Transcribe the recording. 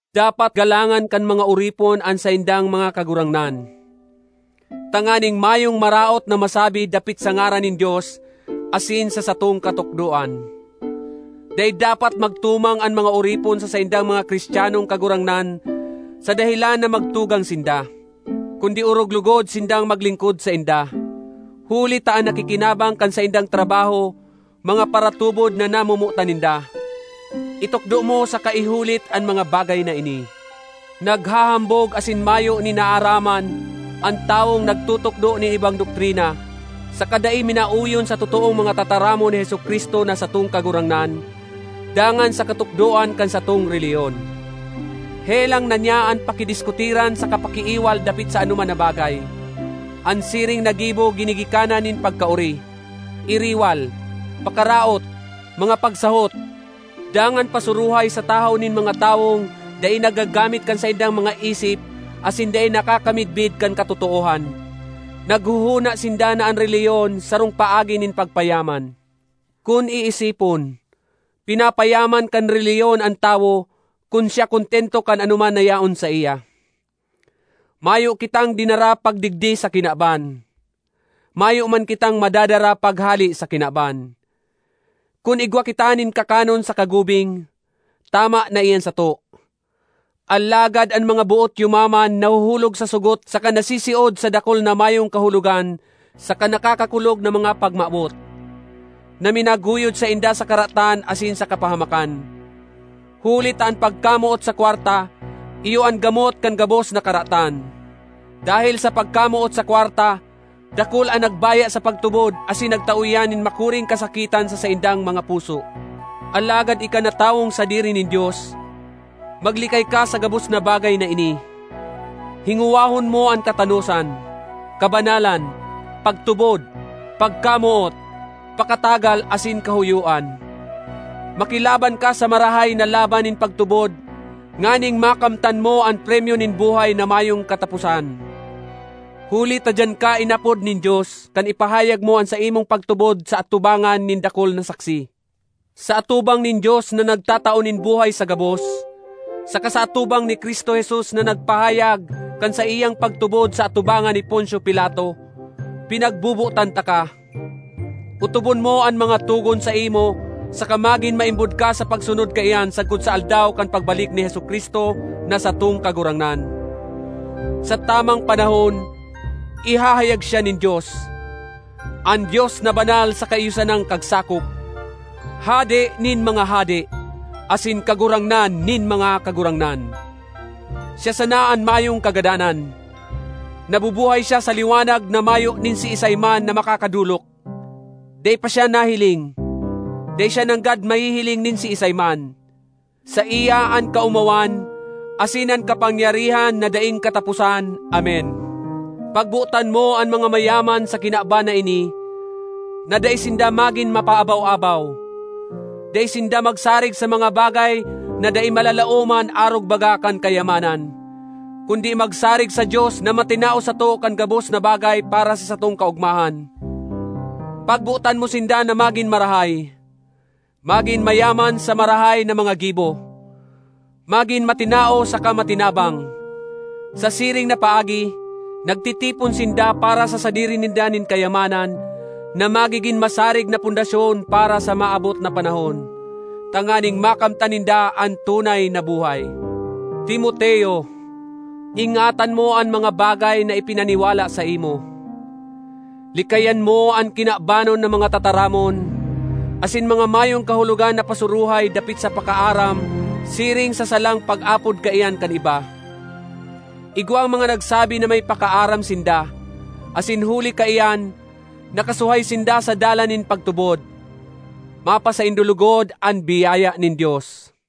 Dapat galangan kan mga oripon an saindang mga kagurangnan, tanganing mayong maraot na masabi dapit sa ngaran nin Dios asin sa satong katukdoan. Dai dapat magtumang an mga oripon sa saindang mga Cristianong kagurangnan sa dahelan na magtugang sinda; kundi orog logod sindang maglingkod sainda, huli ta an nakikinabang kan saindang trabaho mga paratubod na namomotan ninda. Itukdo mo saka ihulit an mga bagay na ini. Naghahambog asin mayo nin naaraman an tawong nagtutukdo nin ibang doktrina saka dai minaoyon sa totoong mga tataramon ni Jesu-Cristo, na satong Kagurangnan, dangan sa katukdoan kan satong relihiyon. Helang na niya an pakidiskutiran saka pakiiwal dapit sa anoman na bagay. An siring na gibo ginigikanan nin pagkaori, iriwal, pakaraot, mga pagsahot, dangan pasuruhay sa tahaw nin mga tawong dai naggagamit kan saindang mga isip asin dai nakakamidbid kan katotoohan. Naghohona sinda na an relihiyon sarong paagi nin pagpayaman. Kun iisipon, pinapayaman kan relihiyon an tawo, kun siya kontento kan anoman na yaon saiya. Mayo kitang dinara pagdigdi sa kinaban. Mayo man kitang madadara paghale sa kinaban. Kun igwa kita nin kakanon saka gubing, tama na iyan sato. Alagad an mga boot yumaman nahuhulog sa sogot saka nasisiod sa dakul na mayong kahulogan saka nakakakulog na mga pagmawot, na minaguyod sainda sa karatan asin sa kapahamakan. Huli ta an pagkamoot sa kwarta iyo an gamot kan gabos na karatan. Dahel sa pagkamoot sa kwarta dakul an nagbaya sa pagtubod asin nagtao iyan nin makuring kasakitan sa saindang mga puso. Alagad ika na tawong sadiri nin Dios, maglikay ka sa gabos na bagay na ini. Hingowahon mo an katanosan, kabanalan, pagtubod, pagkamoot, pakatagal, asin kahoyoan. Makilaban ka sa marahay na laban nin pagtubod nganing makamtan mo an premyo nin buhay na mayong kataposan, huli ta diyan ka inapod nin Dios kan ipahayag mo an saimong pagtubod sa atubangan nin dakul na saksi. Sa atubang nin Dios na nagtatao nin buhay sa gabos, saka sa atubang ni Cristo Jesus na nagpahayag kan saiyang pagtubod sa atubangan ni Poncio Pilato, pinagbobotan taka: otobon mo an mga togon saimo saka magin maimbod ka sa pagsunod kaiyan sagkod sa Aldaw kan pagbalik ni Jesu-Cristo na satong Kagurangnan. Sa tamang panahon, ihahayag siya nin Dios—an Dios na banal saka iyo sanang Kagsakop, Hade nin mga hade, asin Kagurangnan nin mga kagurangnan. Siya sana an mayong kagadanan; nabubuhay siya sa liwanag na mayo nin siisay man na makakadolok. Dai pa siya nahiling; dai siya nanggad mahihiling nin siisay man. Saiya an kaomawan asin an kapangyarihan na daing kataposan! Amen. Pagbotan mo an mga mayaman sa kinaban na ini na dai sinda magin mapaabaw-abaw; dai sinda magsarig sa mga bagay na dai malalaoman arog baga kan kayamanan, kundi magsarig sa Dios na matinao sato kan gabos na bagay para sa satong kaogmahan. Pagbotan mo sinda na magin marahay, magin mayaman sa marahay na mga gibo, magin matinao saka matinabang. Sa siring na paagi, nagtitipon sinda para sa sadiri ninda nin kayamanan na magigin masarig na pundasyon para sa maabot na panahon, tanganing makamtan ninda an tunay na buhay. Timoteo, ingatan mo an mga bagay na ipinaniwala saimo. Likayan mo an kinabanon na mga tataramon asin mga mayong kahulogan na pasuruhay dapit sa “pakaaram” siring sa salang pag-apod kaiyan kan iba. Igwang mga nagsabi na may “pakaaram” sinda, asin huli kaiyan nakasuhay sinda sa dalan nin pagtubod. Mapasaindo logod an biyaya nin Dios.